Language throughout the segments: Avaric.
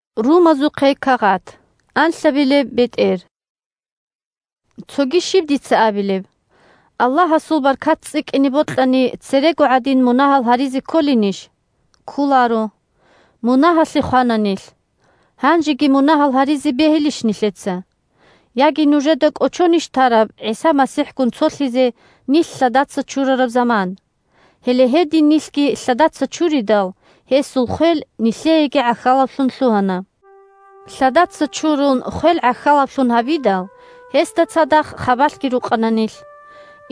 Мунагьалъе хвеялъул магӀна щиб? Цоги щиб дица абилеб? Аллагьасул баркат цӀикӀкӀине бокьани, церего гӀадин мунагьал гьаризе кколинищ? Кколаро! Мунагьалъе хвана нилъ! Гьанжеги мунагьал гьаризе бегьилищ нилъеца? Яги нужеда кӀочонищ тараб ГӀиса МасихӀгун цолъизе нилъ лъадаца чурараб заман? Гьеле гьедин нилъги лъадаца чуридал, гьесул хвел нилъееги гӀахьалаблъун лъугьана. Лъадаца чурун хвел гӀахьалаблъун гьабидал, гьесда цадахъ хабалъги рукъана нилъ.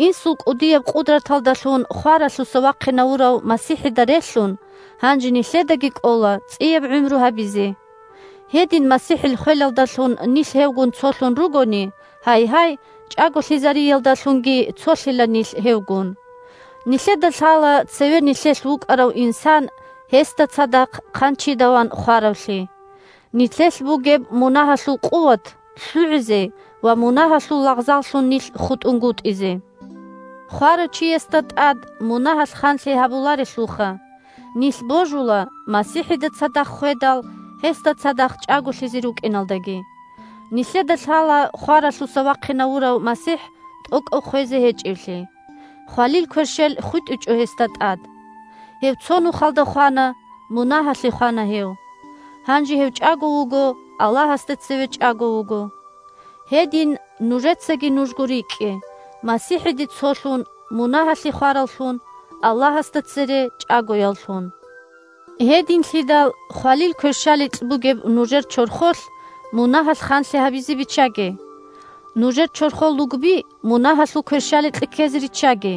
Инсул кӀудияб къудраталдалъун хваралъуса вахъинавурав МасихӀида релълъун, гьанже нилъедаги кӀола цӀияб гӀумру гьабизе. Гьедин МасихӀил хвелалдалъун нилъ гьевгун цолъун ругони, гьайгьай, чӀаголъизариялдалъунги цолъила нилъ гьевгун. Нилъеда лъала цеве нилъелъ вукӀарав инсан гьесда цадахъ хъанчида ван хваравлъи – нилъелъ бугеб мунагьалъул къуват лъугӀизе ва мунагьалъул лагъзаллъун нилъ хутӀунгутӀизе. Хварав чиясда тӀад мунагьалъ ханлъи гьабуларелъулха! Нилъ божула, МасихӀида цадахъ хведал, гьесда цадахъ чӀаголъизе рукӀиналдаги. Нилъеда лъала хваралъуса вахъинавурав МасихӀ тӀокӀав хвезе гьечӀевлъи. Хвалил кверщел хутӀичӀо гьесда тӀад. Гьев цо нухалда хвана, мунагьалъе хвана гьев. Гьанже гьев чӀаго вуго, Аллагьасда цеве чӀаго вуго. Гьедин нужецаги нужго рикӀкӀе, МасихӀиде цолъун, мунагьалъе хвараллъун, Аллагьасда цере чӀагояллъун. Гьединлъидал хвалил кверщаликь бугеб нужер чорхолъ мунагьалъ ханлъи гьабизе биччаге. Нужер чорхол лугби мунагьалъул кверщаликье ккезе риччаге,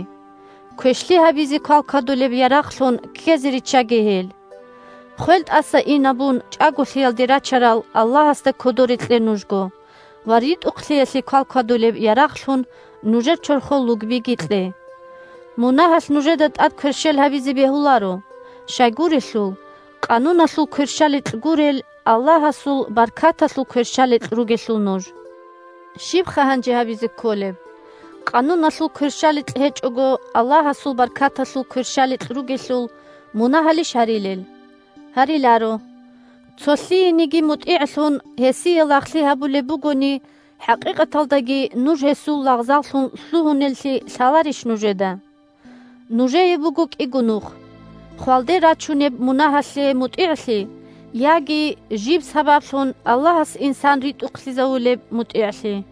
квешлъи гьабизе квалквадулеб ярагълъун ккезе риччаге гьел. Хвел тӀаса инабун чӀаголъиялде рачарал Аллагьасда кодоре кье нужго ва ритӀухълъиялъе квалквадулеб ярагълъун нужер чорхол лугбиги кье. Мунагьалъ нужеда тӀад кверщел гьабизе бегьуларо, щайгурелъул Къануналъул кверщаликь гурел, Аллагьасул баркаталъул кверщаликь ругелъул нуж. Щибха гьанже гьабизе кколеб? Къануналъул кверщаликь гьечӀого, Аллагьасул баркаталъул кверщаликь ругелъул, мунагьалищ гьарилел? Гьариларо! Цо лъиениги мутӀигӀлъун, гьесие лагълъи гьабулеб бугони, хӀакъикъаталдаги нуж гьесул лагъзаллъун лъугьунеллъи лъаларищ нужеда? Нужее буго кӀиго нух: хвалде рачунеб мунагьалъе мутӀигӀлъи яги жиб сабаблъун Аллагьас инсан ритӀухълъизавулеб мутӀигӀлъи.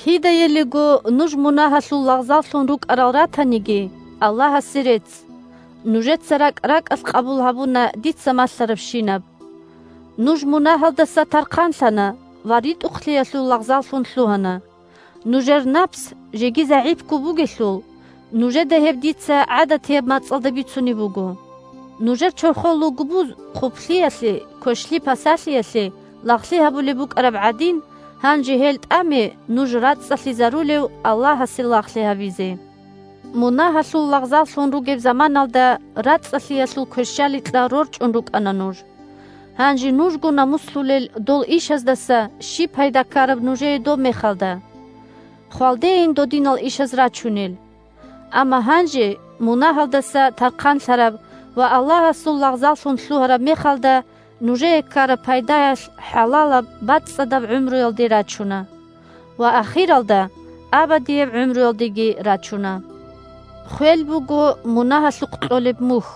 Кидаялиго нуж мунагьалъул лагъзаллъун рукӀарал ратаниги, Аллагьасе рецц, нужеца ракӀ-ракӀалъ къабул гьабуна дица малъарабщинаб. Нуж мунагьалдаса тархъанлъана ва ритӀухълъиялъул лагъзаллъун лъугьана. Нужер напс жеги загӀипго бугелъул, нужеда гьеб дица гӀадатияб мацӀалда бицунеб буго. Нужер чорхол лугбуз хъублъиялъе, квешлъи-пасалъиялъе лагълъи гьабулеб букӀараб гӀадин, гьанже гьел тӀаме нуж рацӀцӀалъизарулев Аллагьасе лагълъи гьабизе. Мунагьалъул лагъзаллъун ругеб заманалда рацӀцӀалъиялъул кверщаликьа рорчӀун рукӀана нуж. Гьанже нужго намуслъулел дол ишаздаса щиб пайда ккараб нужее доб мехалда? Хвалдейин додинал ишаз рачунел! Амма гьанже мунагьалдаса тархъанлъараб ва Аллагьасул лагъзаллъун лъугьараб мехалда нужее ккараб пайдаялъ хӀалалаб-бацӀцӀадаб гӀумруялде рачуна. Ва ахиралда абадияб гӀумруялдеги рачуна! Хвел буго мунагьалъухъ кьолеб мухь,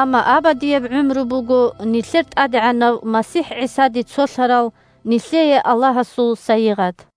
амма абадияб гӀумру буго нилъер ТӀадегӀанав МасихӀ ГӀисаде цолъарал нилъее Аллагьасул сайигъат.